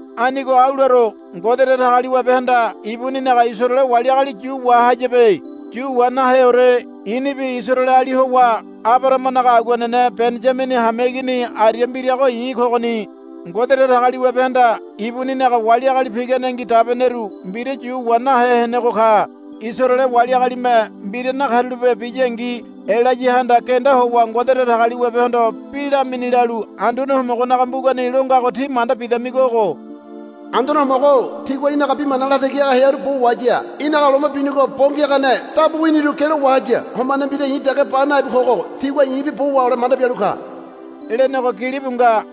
Anigo au laro. Ngode Datagaliwabehanda ibuninaga Isaraele wali agali yu wahayabe. Yu wa naheore. I̱nibi Isaraeleali howa Abarahamanaga aguanene Beniyamini hameigini aria mbirago i̱ kogoni. Ngode Datagaliwabehanda ibuninaga wali agali piganengi dabeneru mbira yu wa nahe henego ka. Isaraele wali agalime mbira nakarulape biyangi Elayahanda genda howa Ngode Datagaliwabehondo bi lamini lalu Anduane Homogonaga mbugani lo ngago tí manda bidamigo ogo. Anduane Homogo-o tigua í̠naga bi mana latagi haga hearu bo wahaya. Í̠naga loma binigo bo ngiagane dabu winiru gialo wahaya. Homane mbira i̱ dege ba nabi kogo tigua i̱bi bo wahole manda bialu ka, lenego gilibu nga.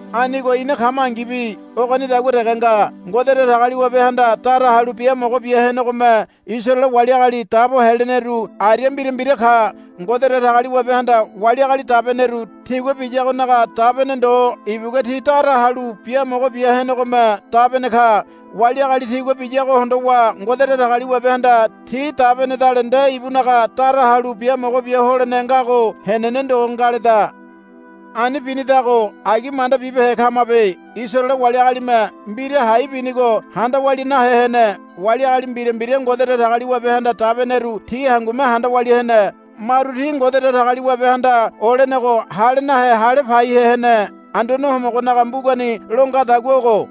Anigo ina kamangibi ogonidagua dege nga. Ngode Datagaliwabehanda dara halu biamogo bia henegome Isaraele wali agali dabo heleneru aria mbira mbira ka. Ngode Datagaliwabehanda wali agali dabeneru tigua biyagonaga dabene ndo ibugua ti dara halu biamogo bia henegome dabene ka. Wali agali tigua biyago hondowa Ngode Datagaliwabehanda ti dabenedale nde ibunaga dara halu biamogo bia holene ngago henene ndo ngaleda. Ani binidago agi manda bibehe kamabe. Isaraele wali agalime mbira hai binigo handa walia nahe hene. Wali agali mbira mbira Ngode Datagaliwabehanda dabeneru ti hangume handa walia hene. Maru ti Ngode Datagaliwabehanda olenego hale nahe hale paihe hene. Anduane Homogonaga mbugani lo ngadagua ogo,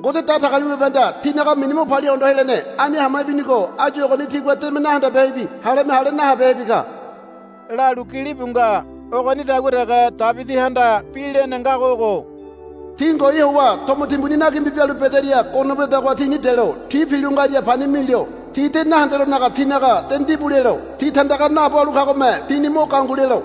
Ngode Datagaliwabehanda tinaga mini mo palia hondo helene. Ani hama ibinigo áyu ogoni tigua deme nahandabehebi haleme hale nahabehebi ka, lalu gilibu nga. Ogonidagua dege Debidihanda bi lene ngago ogo, Ti ngoai howa tomo timbuni nagimbu bialu bedaria gono wedagoha tini delo. Ti pilo ngaria pani milo. Ti de nahendelonaga tinaga de ndibu lelo. Ti tandaga naabo halu kagome tini mo gangu lelo,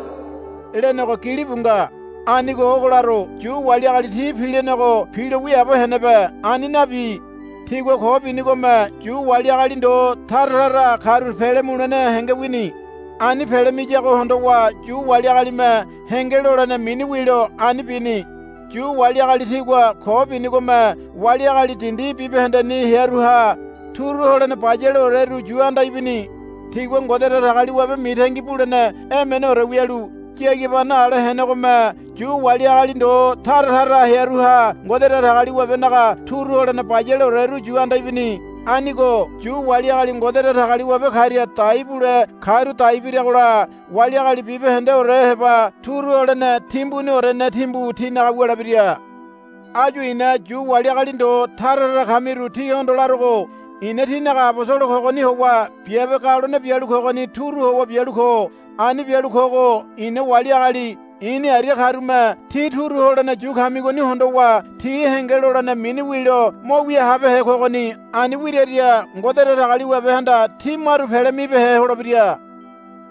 lenego gilibu nga. Anigo ogo laro. Yu wali agali ti pilenego pilo wiaabo henebe. Ani nabi. Tigua ko binigome Yu wali agali ndo tara tara karu pele mulene henge wini. Ani pele miyago hondowa Yu wali agalime henge lolene mini wilo ani bini. Yu wali agali tigua ko binigome wali agali dindi bibahendeni hearuha turu holene bayaleoreru yu anda ibini. Tigua Ngode Datagaliwabe mitangi bulene emeneore wialu yagibano ale henegome Yu wali agali ndo tara tara hearuha Ngode Datagaliwabenaga turu holene bayaleoreru yu anda ibini. Anigo Yu wali agali Ngode Datagaliwabe karia dai bule karu dai biragola wali agali bibahendeore heba turu holene timbuniorene timbu tinaga wulebira. Áyu i̱na Yu wali agali ndo tara tara kamiru tíhondo larogo. Ina tínaga abosolo kogoni howa biabe galone bialu kogoni turu howa bialu ko. Ani bialu kogo i̱na wali agali i̱ni aria karume tí turu holene yu kamigoni hondowa ti henge lolene mini wilo mo wia habehe kogoni. Ani wiraria Ngode Datagaliwabehanda ti maru pele mibehe holebira.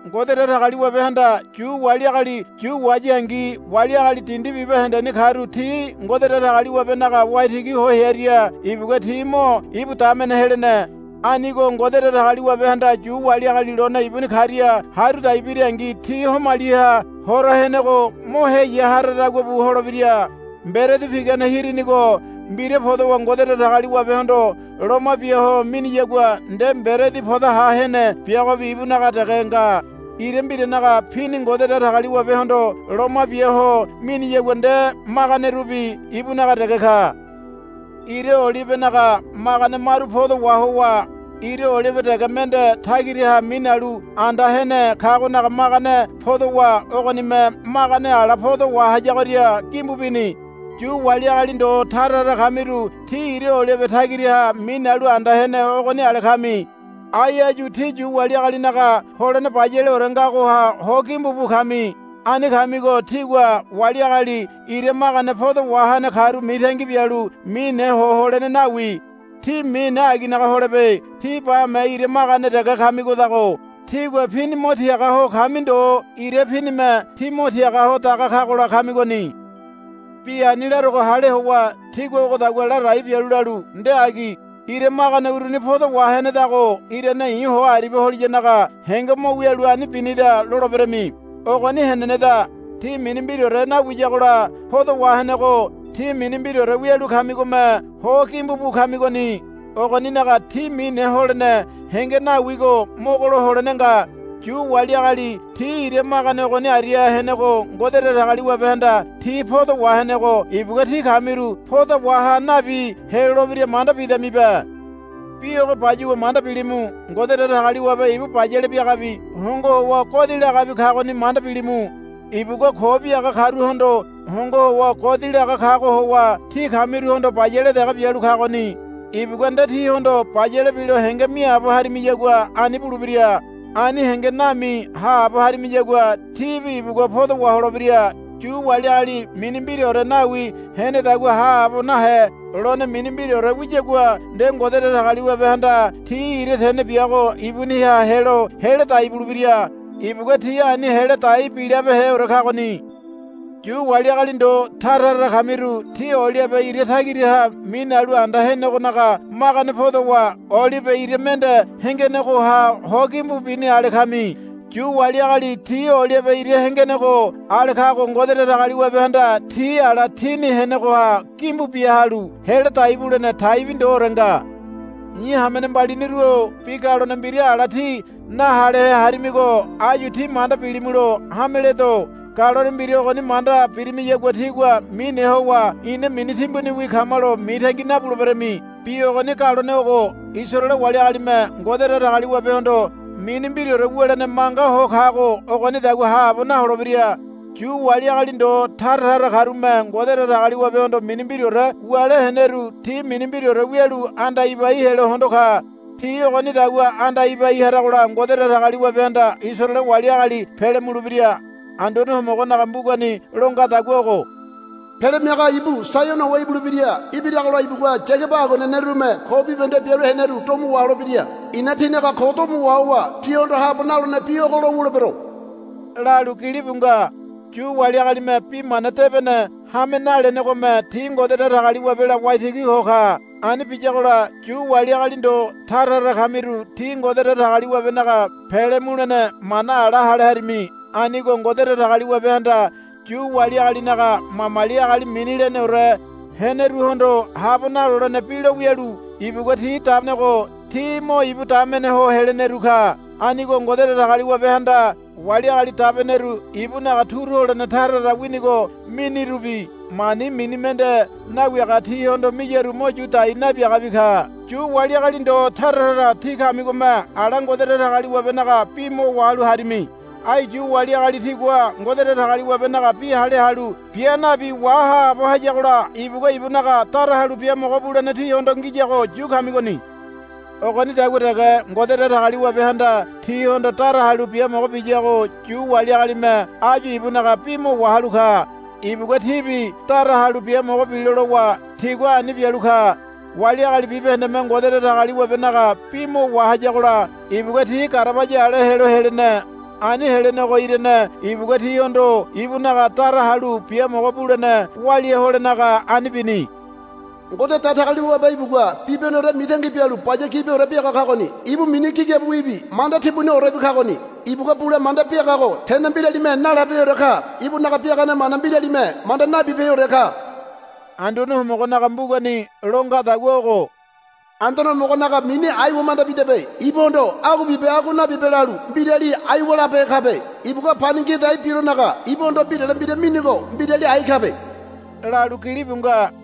Ngode Datagaliwabehanda Yu wali agali yu wahayangi wali agali dindi bibahendeni karu ti Ngode Datagaliwabenaga waitigi ho hearia ibugua ti mo ibu damene helene. Anigo Ngode Datagaliwabehanda Yu wali agali lone ibuni karia haru dai birangi ti homaliha hora henego mo heya haradagua bu holebira. Mberedi pigane hirinigo mbira podowa Ngode Datagaliwabehondo loma bia ho miniyagua nde mberedi podoha hene biagobi ibunaga dege nga. Ira mbiranaga pini Ngode Datagaliwabehondo loma bia ho miniyagua nde maganerubi ibunaga dege ka. Ira olibenaga magane maru podo wahowa ira olibe dege mende tagiraha minalu anda hene kagonaga magane podowa ogonime magane ala podo wahayagoria gimbu bini. Yu wali agali ndo tara tara kamiru tí ira olibe tagiraha minalu anda hene ogoni ale kami. Ai áyu tí Yu wali agalinaga holene bayaleore ngagoha ho gimbu bu kami. Ani kamigo tígua wali agali ira magane podo wahene karu mitangi bialu mine ho holene nawi. Tí mine aginaga holebe. Tí bame ira magane dege kamigodago tígua pini mo tiaga ho kami ndo ira pinime tí mo tiaga ho daga kagola kamigoni. Bi ani larogo hale howa tígua ogodagua ladai bialu lalu, Nde agi. Ira magane uruni podo wahenedago irane i̱ ho aribia holiyanaga henge mo wialu ani binida, loleberami. Ogoni heneneda. Ti mini mbiraore nawiyagola podo wahenego tí mini mbiraore wialu kamigome ho gimbu bu kamigoni. Ogoninaga tí mine holene henge nawigo mogolo holene nga. Yu wali agali ti ira magane ogoni aria henego Ngode Datagaliwabehanda ti podo wahenego ibugua tí kamiru poda waha nabi helolebira manda bidamibe. Bi ogo bayuwa manda bilimu. Ngode Datagaliwabe ibu bayale biagabi hongo howa godi lagabi kagoni manda bilimu. Ibugua ko biaga karuhondo hongo howa godi laga kago howa tí kamiruhondo bayale dege bialu kagoni. Ibugua nde tíhondo bayale bilo henge miaabo harimiyagua ani bulebira. Ani henge nami haabo harimiyagua tíbi ibugua podo waholebira. Yu wali agali mini mbiraore nawi henedagua haabo nahe lone mini mbiraore wiyagua nde Ngode Datagaliwabehanda ti ira tene biago ibuniha helo hela dai bulebira. Ibugua ti ani hela dai bilabeheore kagoni. Yu wali agali ndo tara tara kamiru tí olibe ira tagiraha minalu anda henegonaga magane podowa olibe ira mende hengenegoha ho gimbu bini ale kami. Yu wali agali ti olibe ira hengenego ale kago Ngode Datagaliwabehanda ti ala tini henegoha gimbu bia halu hela dai bulene taibi ndoore nga. I̱ hamene mbaliniru-o bi galone mbira ala tí nahalehe harimigo áyu tí manda bilimulo hameledo. Galone mbira ogoni manda birimiyagua tígua mine howa, Ina mini timbuniwi kamalo, mitangi nabuleberami. Bi ogoni galone ogo. Isaraele wali agalime Ngode Datagaliwabehondo mini mbiraore wulene manga ho kago ogonidagua haabo naholebira. Yu wali agali ndo tara tara karume Ngode Datagaliwabehondo mini mbiraore wule heneru ti mini mbiraore wialu anda ibai helo hondo ka. Ti ogonidagua anda ibai haragola Ngode Datagaliwabehanda Isaraele wali agali pele mulebira. Anduane Homogonaga mbugani lo ngadagua ogo, Pele Miaga ibu Saiono howa ibulebira. Ibiragola ibugua Yagaba aguanenerume ko bibahende bialu heneru domo waholebira. I̱na tinaga ko domo wahowa tihondo habo nalolene bi ogo lo wulebero, lalu gilibu nga. Yu wali agalime Bi Mana Debene hame nalenegome ti Ngode Datagaliwabela waitigi ho ka. Ani biyagola Yu wali agali ndo tara tara kamiru tí Ngode Datagaliwabenaga pele mulene mana ala hale harimi. Anigo Ngode Datagaliwabehanda Yu wali agalinaga mamali agali mini leneore heneruhondo habo nalolene bi lo wialu ibugua ti dabenego ti mo ibu damene ho heleneru ka. Anigo Ngode Datagaliwabehanda wali agali dabeneru ibunaga turu holene tara tara winigo minirubi mani mini mende nawiaga tihondo miyaru mo yu dai nabiagabi ka. Yu wali agali ndo tara tara tí kamigome ala Ngode Datagaliwabenaga bi mo wahalu harimi. Ai Yu wali agali tigua Ngode Datagaliwabenaga bi hale halu bia nabi wahaabo hayagola ibugua ibunaga dara halu biamogo bulene tíhondo ngiyago yu kamigoni. Ogonidagua dege Ngode Datagaliwabehanda tíhondo dara halu biamogo biyago Yu wali agalime áyu ibunaga bi mo wahalu ka. Ibugua tibi dara halu biamogo bilo lowa tigua ani bialu ka. Wali agali bibahendeme Ngode Datagaliwabenaga bi mo wahayagola ibugua ti garabaya ale helo helene. Ani helenego irane ibugua tihondo ibunaga dara halu biamogo bulene walia holenaga ani bini. Ngode Datagaliwabe ibugua bibahendeore mitangi bialu baya gibiore biaga kagoni. Ibu mini gigabiwibi manda timbuniorebi kagoni. Ibugua bule manda biagago tene mbiralime nalabeheore ka. Ibunaga biagane mana mbiralime manda nabibeheore ka. Anduane Homogonaga mbugani lo ngadagua ogo, Anduane Homogonaga mini aiwa manda bidabe. Ibuhondo, Agua bibe agua nabibe, lalu mbirali aiwa labehe kabe. Ibugua pani ngia dai bilonaga ibuhondo mbirale mbira minigo mbirali ai kabe, lalu gilibu nga.